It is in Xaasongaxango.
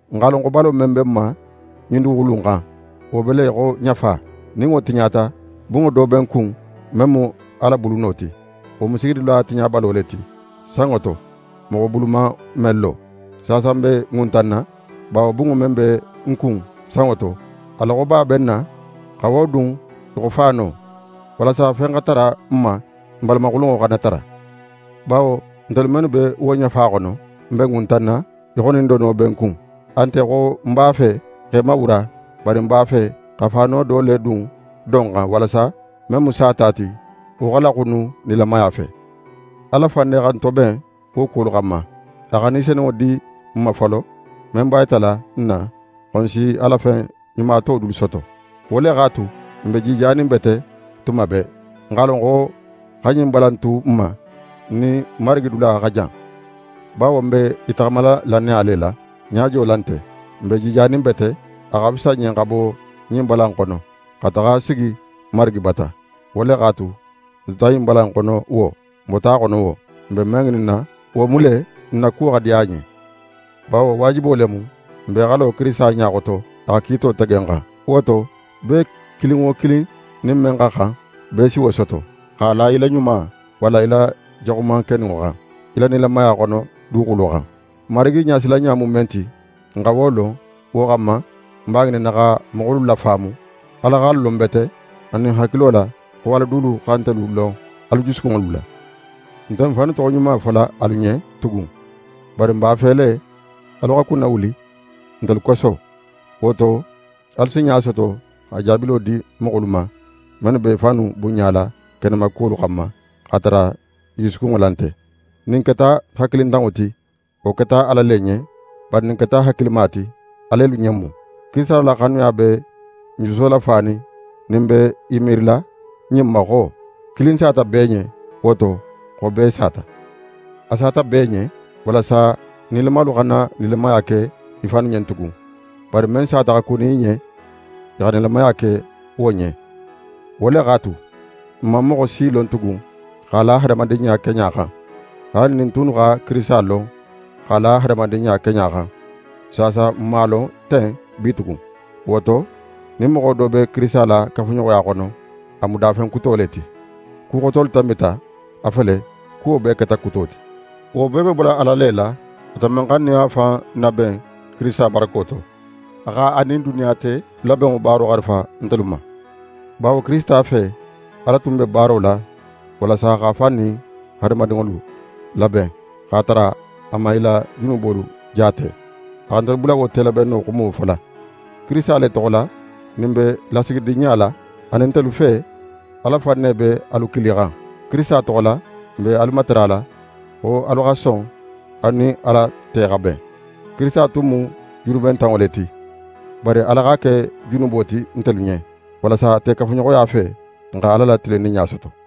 N x'a lon xo balo men be n ma ɲin duguxulu in xan, wo be le í xo ɲafa. Nin wo tiɲata, bunŋo do be n kun, men mu Ala buluno ti. Wo mu sigidula tiɲabalo le ti, sanŋo to, moxo bulu man men lo. Saasa, n be ŋuntanna, bawo bunŋo men be n kun sanŋo to, a loxoba be n na xa wo dun í xo faano, walasa fen xa tara n ma, n balamaxulunŋo xana tara. Bawo ntelu mennu be wo ɲafa xono, n be ŋuntanna, í xo nin dono be n kun. A nte xo n b'a fe x'e mawura, bari n b'a fe xa faano do le dun do in xan, walasa men mu sata ti, wo xa laxunu nilamaya fe. Ala fan ne xa n toben wo kuwolu xanma. A xa Ni Senunŋo di n ma folo, men b'a yitala n na xo n si a la fen ɲuma to dulu soto. Wo le x'a tu, n be jijanin bete tuma bee. N x'a lon xo xa ɲin bala in tu n ma, n nin Marigi dula xa jan. Bawo n be i taxamala lannaya le la, ɲajo la nte. N be jijanin bete, a xa fisa n ɲen xa bo ɲin bala in xono, xa taxa sigi Marigi bata. Wo le x'a tu, n tuta ɲin bala in xono wo, n bota a xono wo, n be men ŋininna, wo mu le n na kuwo xa diya a ɲen. Bawo waajibo le mu n bee xa lo Kirisita ɲa xoto a xa kiito tege n xan. Wo to, bee kilin wo kilin nin men xa xan, bee si wo soto, x'a la í la ɲuma walla í la jaxuman keninŋo xan, í la nilamaya xono duguxulo xan. Marigi ɲasilanɲa mu men ti, n xa wo lon, wo xanma, n b'a ŋininna xa moxolu lafaamu. Ala xa n lon bete, anin ń hakilo la xo alu dulu xa nte lon alu jusukunŋolu la. N nte n fannu toxoɲuma fola alu ɲen tugun, bari n b'a fe le alu xa kunnawuli ntelu koso. Wo to, alu si ɲa soto xa jaabilo di moxolu ma, mennu be i fannu bunɲala kenema kuwolu xanma x'a tara i jusukunŋo la nte. Nin n keta hakilintanŋo ti, wo keta Ala le ɲen; bari nin n keta hakilima ti, alelu ɲen mu. Kirisita la xanuya be n juso lafanin nin n be i miirila ɲin ma xo: Kilin sata bee ɲen, wo to xo bee sata. A sata bee ɲen, walasa nilamalu xana nilamaya ke i fannu ɲen tugun, bari men sata xa kuni i ɲen, i xa nilamaya ke wo ɲen. Wo le x'a tu, n man moxo si lon tugun x'a la hadamadinɲa keɲa xan. Haali nin n tunnu xa Kirisita lon x'a la hadamadinɲa keɲa xan, saasa n man a lon ten bitugun. Wo to, nin moxo do be Kirisita la kafuɲoxoya xono, a mu dafen kuto le ti. Ku xotolu tanbita, a fele, kuwo bee keta kuto ti. Wo bee be bola Ala le la, ate men xa n nin a fan naben Kirisita barako to. A xa a nin duniya te labenŋo baaro xarifa ntelu ma. Bawo Kirisita fe, Ala tun be baaro la, walasa x'a fan nin hadamadinŋolu laben, x'a tara a man i la junubolu jaate. A xa ntelu bula wo telabenno xumo fola. Kirisita le toxo la, nin n be lasigidinɲa la, anin ntelu fe, Ala fan ne be alu kilixan. Kirisita toxo la, n be alu matarala xo alu xa son alu nin Ala te xa ben. Kirisita tun mu junubentanŋo le ti, bari Ala x'a ke junubo ti ntelu ɲen, walasa ate kafuɲoxoya fe, n xa Ala la tilinninɲa soto.